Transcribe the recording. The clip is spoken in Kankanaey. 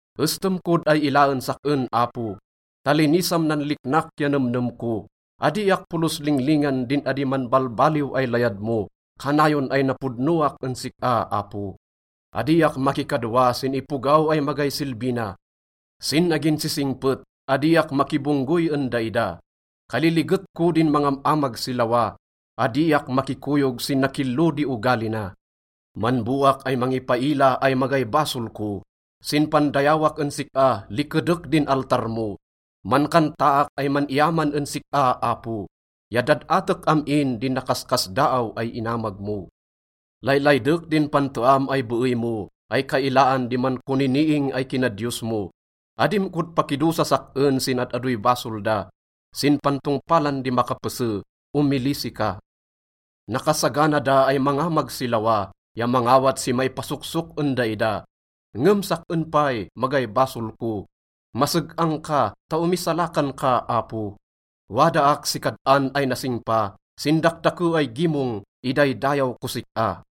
Estem kod ay ilaen sak-en, Apo, ta linisam nan liknak ya nemnem ko. Adiak polos linglingan din adi manbalbaliw ay layad mo, kanayon ay napodnoak en sik-a, Apo. Adiak makikadwa sin ipogaw ay magay silbi na. Sin aginsisingpet, adiak makibonggoy en daida. Kaliliget ko din mangam-amag si lawa, adiak makikoyog sin nakillo di ogali na. Manboak ay mangipaila ay magay basol ko. Sin pandayawak en sik-a, likedek din altar mo. Mankantaak ay man-iyaman en sik-a, Apo, ya dad-atek am-in din nakaskasdaaw ay inamag mo. Laylaydek din panteam ay beey mo ay kailaan di mankoniniing ay kinadiyos mo. Adim kod pakidosas sak-en sin ad-adoy basol da, sin pantongpalan di makapese, omilisi ka. Nakasagana da ay mangamag si lawa ya mangawat si maipasoksok en daida. Ngem sak-en pay, magay basol ko. Maseg-ang ka ta omisalakan ka, Apo. Wadaak si kad-an ay nasingpa, sin dakdake ay gimong, idaydayaw kos sik-a.